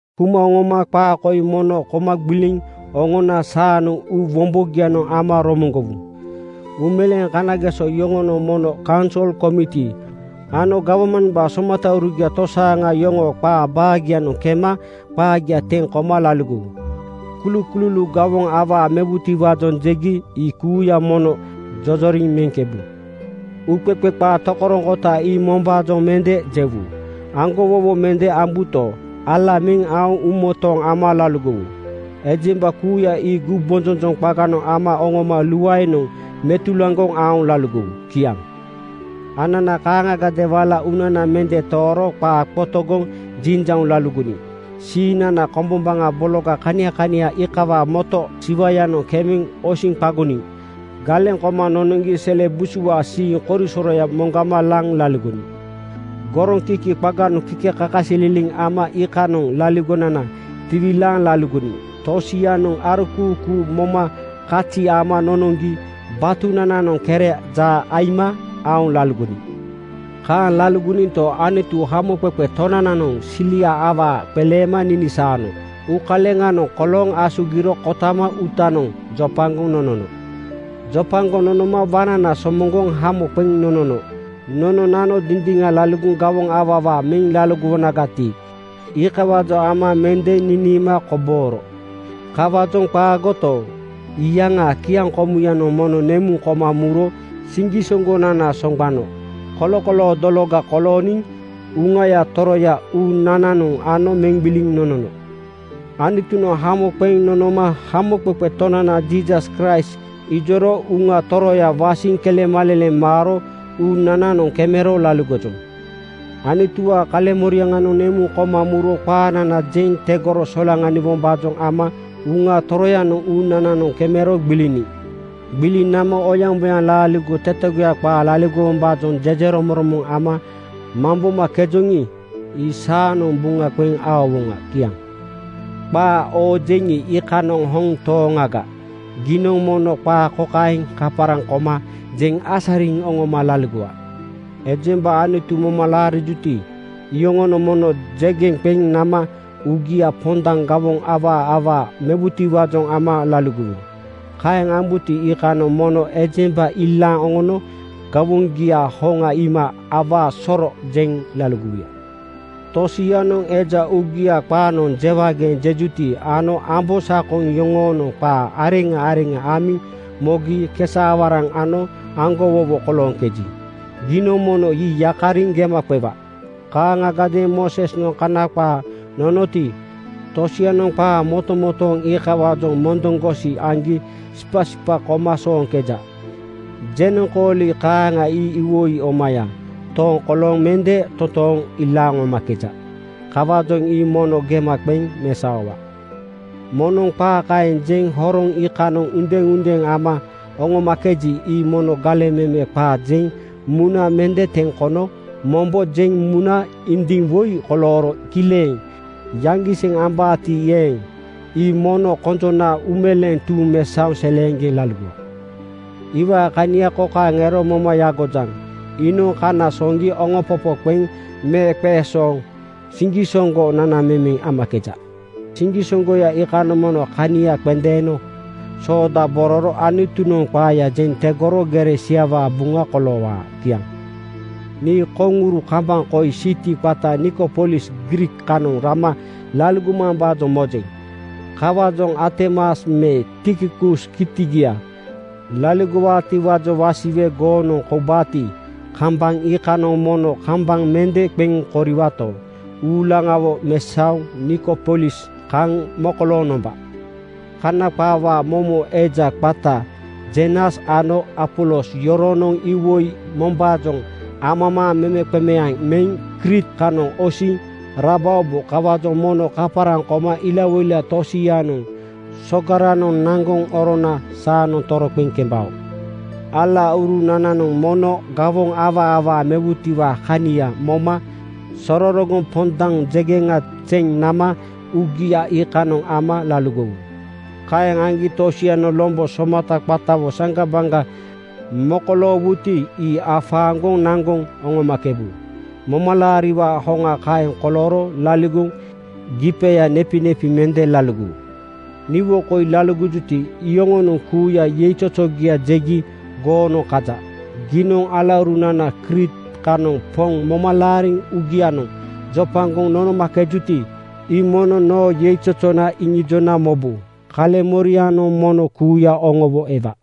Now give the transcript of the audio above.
Kuma oŋoma qaa koi mono koma gbiliŋ oŋona saanoŋ uu wombogianoŋ ama romoŋgowu: Uumeleeŋ kanageso yoŋonoŋ mono kaunsol komiti ano gawmambaa somataurugia tosaaŋa yoŋoo qaa baagianoŋ kema qaagia teŋ koma laligowu. Kulukululuu gawoŋ awaa mewutiwaajoŋ jegi ii kuuya mono jojoriŋ meŋkebu. Uuqeqe qaa tokoroŋkota ii mombaajoŋ mende jewu. Aŋgowowo mende ambuto, ala meŋ aoŋ uumotooŋ ama laligowu. Ejemba kuuya ii gumbonjonjoŋ qaganoŋ ama oŋoma uuluaenoŋ metulaŋgoŋ aoŋ laligowu. Kiaŋ. Anana kaaŋagadeeŋ wala uunana mende tooro qaa qotogoŋ jinjauŋ laligoniŋ. Siiŋnana kombombaŋa bologa kania kania iikawaa moto siwayanoŋ kemeŋ osiŋ qagoniŋ galeŋ koma nonoŋgi sele busuwaa siiŋ korisoroya moŋgama laŋ laligoniŋ. Goroŋkiki qaga-noŋ kikekakasililiŋ ama iikanoŋ laaligonana tiwilaaŋ laligoniŋ. Tosianoŋ arokuukuu moma kazi ama nonoŋgi batunananoŋ kere jaa aima aoŋ laligoniŋ. Kaeŋ laligoninto, Anutu Hamoqeqe Tonananoŋ silia awaa qeleema ninisaano uukaleŋanoŋ kolooŋ asugiro kotama uutanoŋ jopagoŋ nonono. Jopagoŋ nonoma waŋnana somoŋgoŋ hamo qeŋ nonono. Nononano dindiŋa laligoŋ gawoŋ awaa awaa meŋ laligowonagati, iikawaajoŋ ama mende niniima kobooro. Kawaajoŋ qaagoto, iyaŋaa kiaŋkomuyanoŋ mono nemuŋ koma muro siŋgisoŋgonana soŋgbano kolokoloo dologa kolooniŋ Uŋaya Toroya uunananoŋ ano meŋ gbiliŋ nonono. Anutunoŋ hamo qeŋ nonoma Hamoqeqe Tonana Jiisas Kraist ijoro Uŋa Toroya wasiŋ kelemaleleŋ maaro uunananoŋ kemero laligojoŋ. Anutuwaa kaleŋmoriaŋanoŋ nemuŋ koma muro qaanana jeŋ tegoro solaŋaniwombaajoŋ ama Uŋa Toroyanoŋ uunananoŋ kemero gbiliniŋ. Gbiliŋ nama oyaŋboyaŋ laaligo tetegoya qaa laligowombaajoŋ jejeromoŋromoŋ ama mambomakejoŋi, ii saanoŋ buŋa qeŋ aowoŋa. Kiaŋ. Qaa oojeŋi, iikanoŋ hoŋ tooŋaga. Giinoŋ mono qaa kokaeŋ kaparaŋ koma jeŋ asariŋ oŋoma laligowa: Ejemba Anutu moma laarijuti, iyoŋonoŋ mono jegeŋ qeŋ nama uugia pondaŋ gawoŋ awaa awaa mewutiwaajoŋ ama laligowu. Kaeŋ ambuti, iikanoŋ mono ejemba ilaaŋ oŋono gawoŋgiaa hoŋa iima “Awaa soro!” jeŋ laligowuya. Tosianoŋ eja uugia qaanoŋ jewageeŋ jejuti ano ambosakoŋ yoŋoonoŋ qa areŋa areŋa amiŋ mogi kesa-awaraŋ ano aŋgowowo kolooŋkeji, giinoŋ mono ii yakariŋ gema qewa. Kaaŋagadeeŋ Moosesnoŋ Kana qaa nononoti, tosianoŋ qaa motomotooŋ iikawaajoŋ mondoŋgosi aŋgi sipasipa koma sooŋkeja. Jenoŋkooli kaaŋa ii iwoi omaya tooŋ kolooŋ mende totooŋ ilaaŋ oŋomakeja. Kawaajoŋ ii mono gema qeŋ mesaowa. Moŋnoŋ qaa kaeŋ jeŋ horoŋ iikanoŋ undeundeeŋ ama oŋomakeji, ii mono galeŋ meme qaa jeŋ muna mende teŋ kono mombo jeŋ muna indiŋ woi kolooro kileŋ yaŋgiseŋ ambaati eeŋ, ii mono konjona uumeleeŋ tuuŋ mesaoŋ seleeŋgeŋ laligowa. Iwaa kania kokaeŋ ero moma yagojaŋ: Iinoŋ kana soŋgiŋ oŋompopo qeŋ meeqeesooŋ siŋgisoŋgo nanamemeŋ amakeja. Siŋgisoŋgoya iikanoŋ mono kania qendeeno soodabororo Anutunoŋ qaaya jeŋ tegoro gere siawaa buŋa koloowaa. Kiaŋ. Nii koŋuru kambaŋ koi siti qata Nikopolis Griik kanoŋ rama laligomambaajoŋ mojeŋ. Kawaajoŋ Artemas me Tikikus kitiga laligowaatiwaajoŋ wasiwe goonoŋ koubaati, kambaŋ iikanoŋ mono kambaŋ mende qeŋ koriwaato, uulaŋawo mesaoŋ Nikopolis kaŋ mokolooŋ nomba. Kana qaawaa momo eja (lawyer) qata Zenas ano Apolos yoronoŋ iwoi mombaajoŋ amamaaŋ memeqemeaŋ meŋ Kriit kanoŋ osiŋ rabaobo. Kawaajoŋ mono kaparaŋ koma ilawoila tosianoŋ sogaranoŋ naŋgoŋ orona saanoŋ toroqeŋ kembao. Alaurunananoŋ mono gawoŋ awaa awaa mewutiwaa kania moma sororogoŋ pondaŋ jegeŋa zeŋ nama uugia iikanoŋ ama laligowu. Kaeŋ aŋgi tosianoŋ lombo somata qatawo saŋgabaŋga mokoloowuti, ii afaaŋgoŋ naŋgoŋ oŋomakebu. Momalaariwaa hoŋa kaeŋ kolooro laaligo gipeya (auta) nepinepi mende laligowu. Niwo koi laligojuti, iyoŋonoŋ kuuya yeizozogia jegi goonoŋ kaja. Giinoŋ alaurunana Kriit kanoŋ Poŋ moma laariŋ uugianoŋ jopagoŋ nonomakejuti, ii mono noo yeizozona iŋijona mobu. Kaleŋmorianoŋ mono kuuya oŋowo ewa.